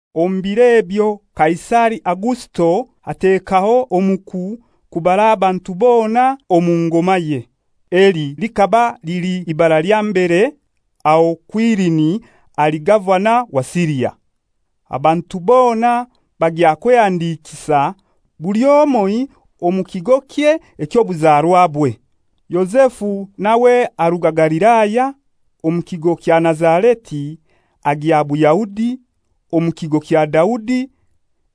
Omu biro ebyo Kaisari Augusito atekaho omuku kubara abantu bona omu ngomaye. Eli likaba lili libara lya mbere, aho Kwirini ali gavana wa Siria. Abantu bona bagya kwehandikisa buli omoi omu kigokye eky'obuzarwabwe. Yozefu nawe aruga Galilaya, omu kigo kya Nazareti agya Buyahudi, omu kigo kya Daudi,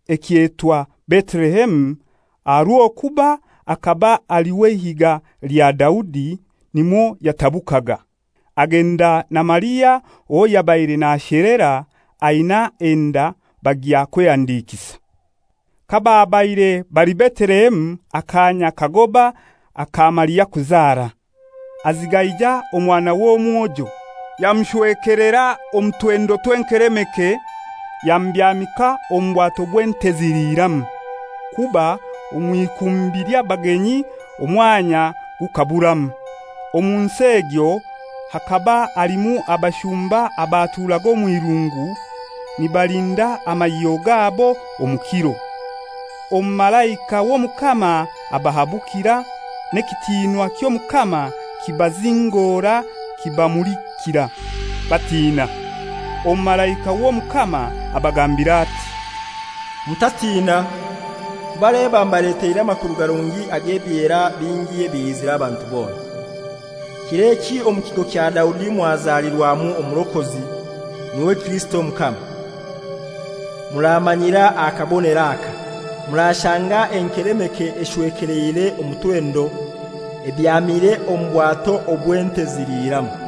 ekyetwa Betelehemu, aha rw'okuba akaba ali w'eihiga lya Daudi, nimwo yatabukaga. Agenda na Maria owo yabaire nashelera, aina enda, bagya kwehandikisa. Kababaire bali Betelehemu akanya kagoba aka Maria kuzara. Azigaija omwana w'omwojo, yamushwekelera omu twendo tw'enkelemeke, yamubyamika omu bwato bw'ente ziliiramu, kuba omw'ikumbi ly'abagenyi omwanya gukaburamu. Omu nsi egyo hakaba halimu abashumba abaturaga omw'irungu, nibalinda amahyo gabo omu kiro. Omumalaika w'Omukama abahabukira, n'ekitinwa ky'Omukama kibazingora kibamulikira, batina. Omumalaika w'Omukama abagambira ati, «Mutatina, kuba leba mbaleteire amakuru garungi ag'ebyera bingi ebiliizira abantu bona. Kir'eki omu kigo kya Daudi mwazalirwamu Omurokozi, n'iwe Kirisito Omukama. Muramanyira aha kabonero aka: Murashanga enkelemeke eshwekeleire omu twendo, ebyamire omu bwato obw'ente ziliiramu.»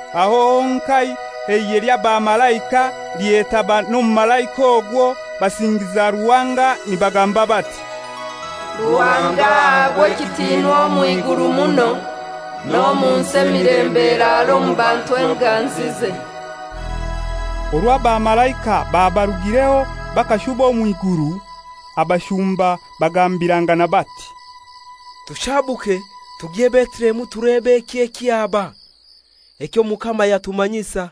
Aho honkai eihe ly'abamalaika lyetaba n'omumalaika ogwo basingiza Ruhanga nibagamba bati, «Ruhanga ahabwe ekitinwa omw'iguru muno, n'omunsi emilembe eraare omu bantu enganzize!» Orwo abamalaika babarugireho bakashuba omw'iguru, abashumba bagambirangana bati, «Tushabuke tugye Betelehemu tulebe eki ekyaba, eky'Omukama yatumanyisa.»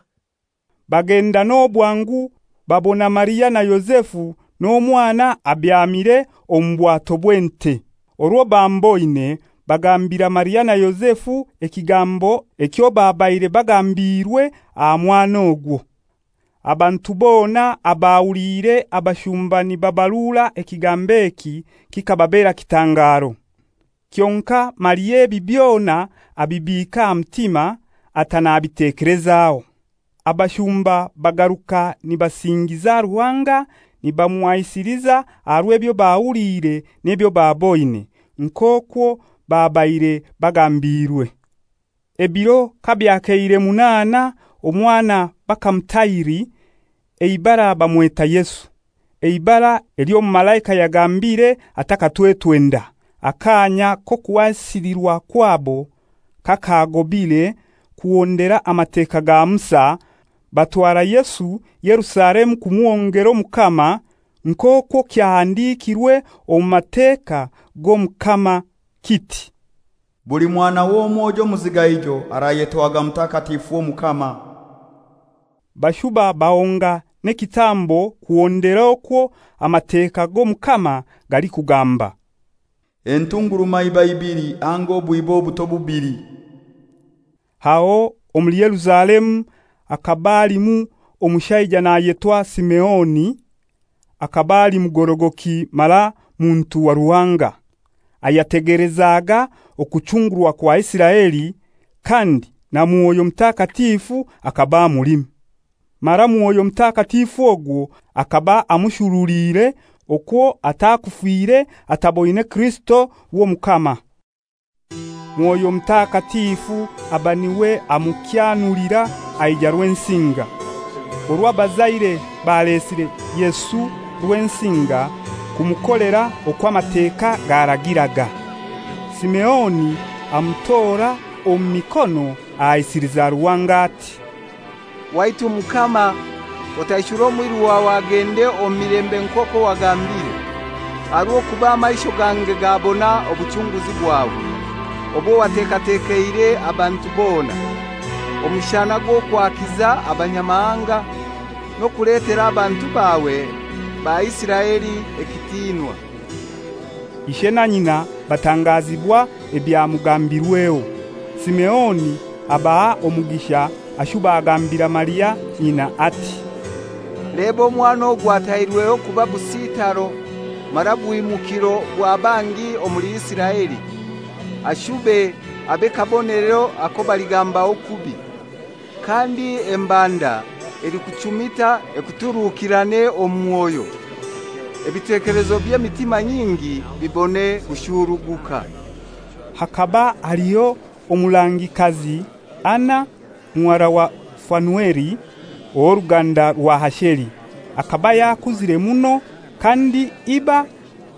Bagenda n'obwangu, babona Maria na Yozefu n'omwana abyamire omu bwato bw'ente. Orwo bamuboine, bagambira Maria na Yozefu ekigambo ekyo babaire bagambiirwe aha mwana ogwo. Abantu bona abahuliire abashumba nibabarura ekigambo eki kibabera kitangaro. Kyonkai Maria ebi byona abibiika aha mutima, ata nabitekelezaho. Abashumba bagaruka nibasingiza Ruhanga, nibamuhaisiliza aha rw'ebyo bahuliire n'ebyo baboine, nk'okwo babaire bagambiirwe. Ebiro kabyakeire munaana omwana bakamutahiri, eibara bamweta Yesu, eibara ely'omumalaika yagambiire atakatwetwe nda. Akaanya k'okuhasilirwa kwabo kakagobire kuhondera Amateka ga Musa, batwara Yesu Yerusalemu kumuhongera Omukama (nk'okwo kyahandikirwe omu Mateka g'Omukama kiti, «Buli mwana w'omwojo omuzigaijo arayetwaga mutakatifu w'Omukama.») Bashuba bahonga n'ekitambo kuhondera okwo Amateka g'Omukama galikugamba, «Entungurumaiba ibili anga obwiba buto bubili.» Aho omuli Yerusalemu hakaba halimu omushaija nayetwa Simeoni, akaba ali mugorogoki mara muntu wa Ruhanga, ayategelezaga okuchungurwa kwa Isiraeli, kandi na Mwoyo Mutakatifu akaba amulimu. Mara Mwoyo Mutakatifu ogwo akaba amushuruliire okwo atalifa ataboine Kirisito w'Omukama. Mwoyo Mutakatifu aba n'iwe amukyanulira, aija Rwensinga. Orwo abazaire balesire Yesu Rwensinga, kumukolera okwo Amateka garagiraga. Simeoni amutora omu mikono ahaisiliza Ruhanga ati, «Waitu Mukama, otaishure omwiru wawe agende omu milembe nk'okwo wagambire; aha rw'okuba amaisho gange gabona obuchunguzi bwawe obwo watekatekeire abantu bona, omushana gw'okwakiza Abanyamahanga, n'okuletera abantu bawe ba Isiraeli ekitinwa.» Ishe na nyina batangazibwa ebyamugambirweho. Simeoni abaha omugisha ashuba agambira Maria nyina ati, «Leba omwana ogu atairweho kuba busitaro mara bwimukiro bwa bangi omuli Isiraeli, ashube abe kabonero ako baligambaho kubi; (kandi embanda elikuchumita ekuturukirane omu mwoyo), ebitekelezo by'emitima nyingi bibone kushuruguka.» Hakaba haliho omurangikazi, Ana, muhara wa Fanueli, ow'oruganda rwa Asheri. Akaba yakuzire muno, kandi iba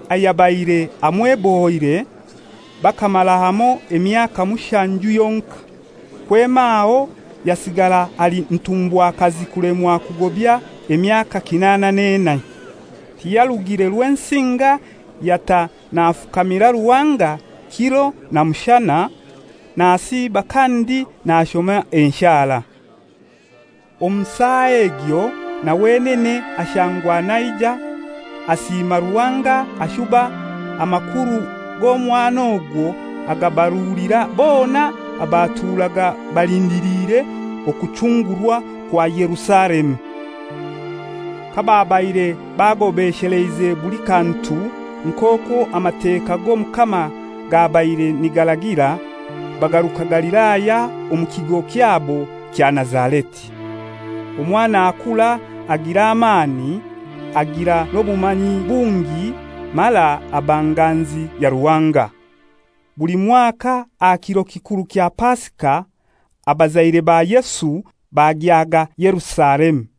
ayabaire amwebohoire bakamara hamoi emyaka mushanju yonkai. Kwema aho yasigara ali ntumbwakazi kulemwa kugobya emyaka kinana n'enai. Tiyarugire Rwensinga, yata nafukamira Ruhanga kiro na mushana, nasiiba kandi nashoma enshara. Omu saa egyo na wenene ashangwa naija, asiima Ruhanga ashuba amakuru g'omwana ogwo agabarulira bona abaturaga balindiliire okuchungurwa kwa Yerusalemu. Kababaire bagobesheleize buli kantu nk'okwo Amateka g'Omukama gabaire nigaragira, bagaruka Galilaya omu kigo kyabo kya Nazareti. Omwana akura agira amani, agira n'obumanyi bungi, mara aba nganzi ya Ruhanga. Buli mwaka aha kiro kikuru kya Pasika, abazaire ba Yesu bagyaga Yerusalemu.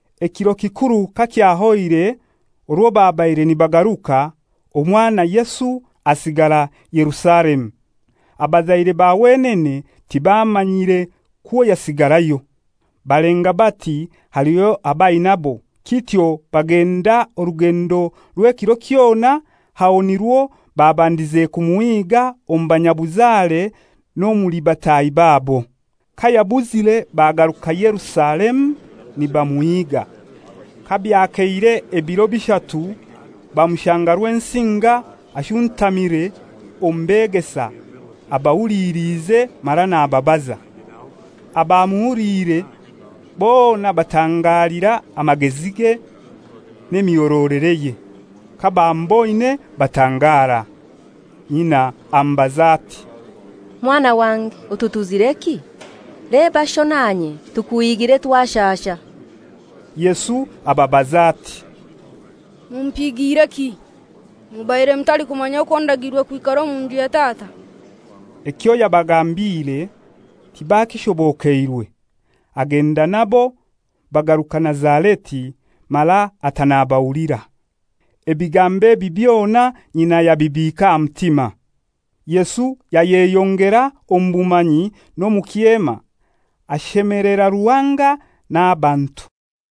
Ekiro kikuru kakyahoire orwo babaire nibagaruka, omwana Yesu asigara Yerusalemu. Abazaire ba wenene tibamanyire kwo yasigarayo. Balenga bati aliho ab'ainabo, kityo bagenda orugendo rw'ekiro kyona, aho nirwo babandize kumuhiiga omu banyabuzare n'omuli bataahi babo. Kayabuzire bagaruka Yerusalemu nibamuhiga. Kabyakeire ebiro bishatu, bamushanga Rwensinga, ashuntamire omu beegesa, abahuliliize mara nababaza. Abamuhuliire bona batangalira amagezige n'emihorolereye. Kabamuboine batangara. Nyina amubaza ati, «Mwana wange, otutuzireki? Leba sho nanye tukuhiigire twashasha.» Yesu ababaza ati, «Mumpigiireki? Mubaire mutalikumanya okwo ndagiirwe kwikara omu nju ya Tata?» Ekyo yabagambiire tibakishobokeirwe. Agenda nabo, bagaruka Nazareti, mara ata nabahulira. Ebigambo ebi byona nyina yabibiika aha mutima. Yesu ayeyongera omu bumanyi n'omu kyema, ashemelera Ruhanga n'abantu.